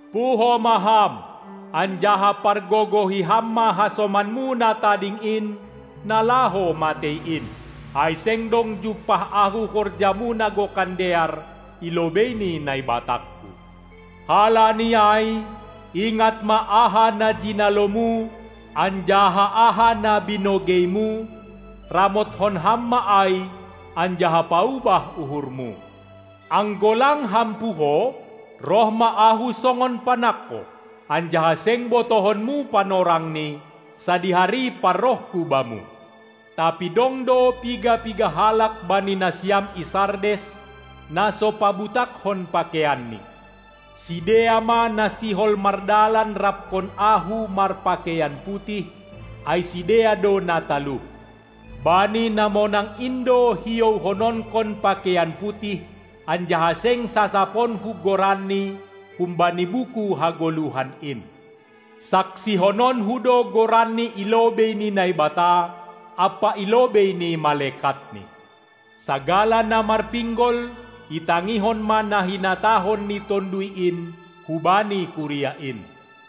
Puho ma ham, anjaha pargogohi ham ma hasomanmu na tading in, na laho matei in; ai seng dong jumpah Ahu horjamu na gokan dear i lobei ni NaibatangKu. Halani ai ingat ma aha na jinalomu anjaha aha na binogeimu, ramothon ham ma ai, anjaha paubah uhurmu. Anggo lang ham puho, roh ma Ahu songon panangko, anjaha seng botohonmu panorangni, sadihari parrohKu bamu. Tapi dong do piga-piga halak bani nasiam i Sardes, na so pabutakkon pakeianni; sidea ma na sihol mardalan rapkon Ahu marpakeian putih, ai sidea do na talup. Bani na monang in do hiohononkon pakeian putih, anjaha seng sasaponKu goranni humbani buku hagoluhan in. SaksihononKu do goranni i lobei ni Naibata ampa i lobei ni malekatNi. Sagala na marpinggol itangihon ma na hinatahon ni Tonduy in hubani kuria in.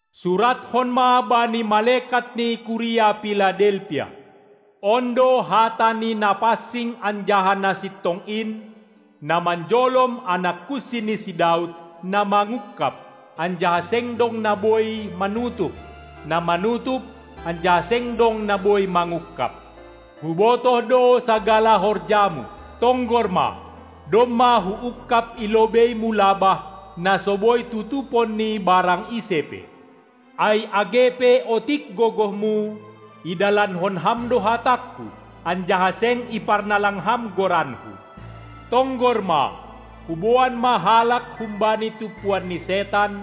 Surathon ma bani malekat ni kuria Piladelpia: On do hata ni Napansing anjaha Nasintong in, na manjolom anak kunsi ni si Daud, na mangungkab, anjaha seng dong na boi manutup, na manutup, anjaha seng dong na boi mangungkab. Hubotoh do sagala horjamu. Tonggor ma, domma Huungkab i lobeimu labah, na so boi tutupon ni barang ise pe. Ai age pe otik gogohmu, idalankon ham do HatangKu, anjaha seng iparnalang ham goranKu. Tonggor ma, huboan ma halak humbani tumpuan ni setan,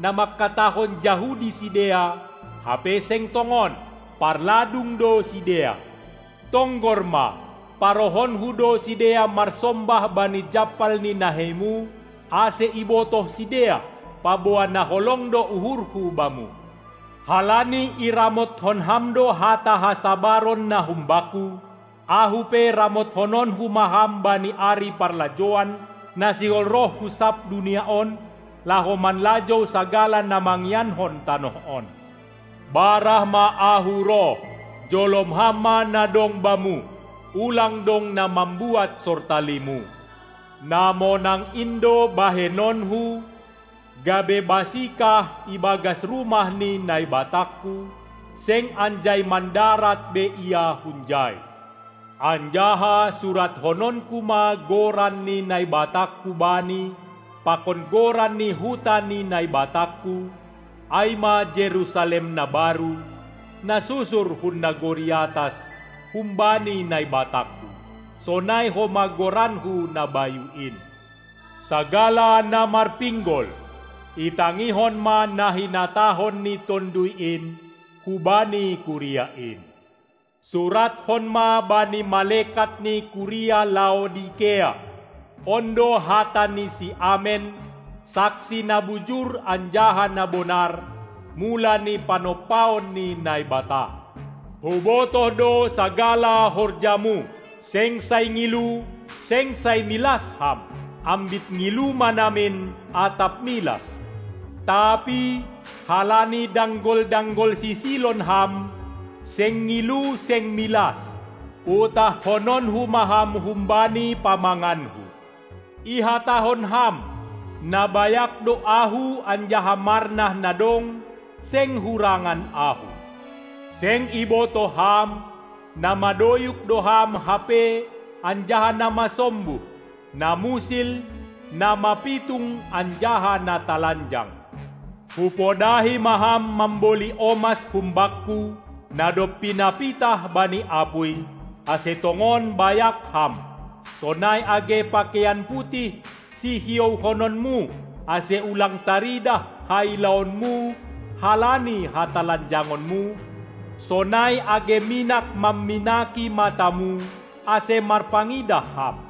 na manghatahon Jahudi sidea, hape seng tongon, parladung do sidea. Tonggor ma, parohonKu do sidea marsombah bani jampal ni naheimu, ase ibotoh sidea, paboa na holong do uhurHu bamu. Halani iramotkon ham do hata hasabaron na humbakku, Ahu pe ramothononKu ma ham bani ari parlajouan, na sihol roh hu sab dunia on, laho manlajou sagala na mangiankon tanoh on. Barah ma Ahu roh! Jolom ham ma na dong bamu, ulang dong na mambuat sortalimu! Na monang in do bahenonKu gabe basikah ibagas rumah ni NaibatangKu, seng anjai mandarat be ia hunjai; anjaha surathononKu ma goran ni NaibatangKu bani pakon goran ni huta ni NaibatangKu, ai ma Jerusalem na baru, na susur hun nagori atas humbani NaibatangKu, sonai homa goranKu na bayu in. Sagala na marpinggol itangihon ma na hinatahon ni Tonduy in hubani kuria in! Surathon ma bani malekat ni kuria Laodikea: On do hata ni si Amen, Saksi na bujur anjaha na bonar, mula ni panompaon ni Naibata. Hubotoh do sagala horjamu: Seng sai ngilu, seng sai milas ham. Ambit ngilu ma namin atap milas! Tapi, halani danggol-danggol sisilon ham, seng ngilu seng milas, utahhononKu ma ham humbani pamanganKu. Ihatahon ham: Na bayak do ahu anjaha marnah na dong, seng hurangan ahu. Seng ibotoh ham, na madoyuk do ham hape anjaha na masombuh, na musil, na mapitung anjaha na talanjang. Hupodahi ma ham mamboli omas hum Bakku, na dob pinapitah bani apuy, ase tongon bayak ham, sonai age pakeian putih sihiouhononmu, ase ulang taridah hailaonmu halani hatalanjangonmu, sonai age minak mamminaki matamu, ase marpangidah ham.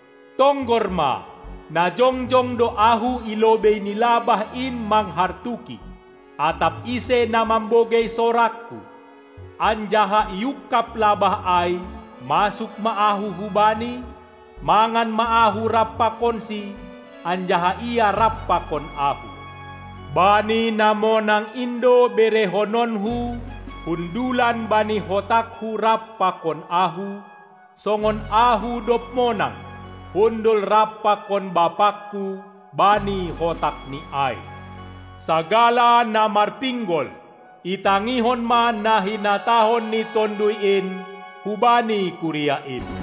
Tonggor ma, na jongjong do Ahu i lobei ni labah in manghartuki. Atap ise na mambogei sorangKu anjaha iungkab labah ai, masuk ma Ahu hubani, mangan ma Ahu rap pakonsi anjaha ia rap pakon Ahu. Bani na monang in do berehononKu hundulan bani hotakKu rap pakon Ahu, songon Ahu, dob monang, hundul rap pakon BapangKu bani hotakNi ai. Sagala na marpinggol itangihon ma na hinatahon ni Tonduy in hubani kuria in.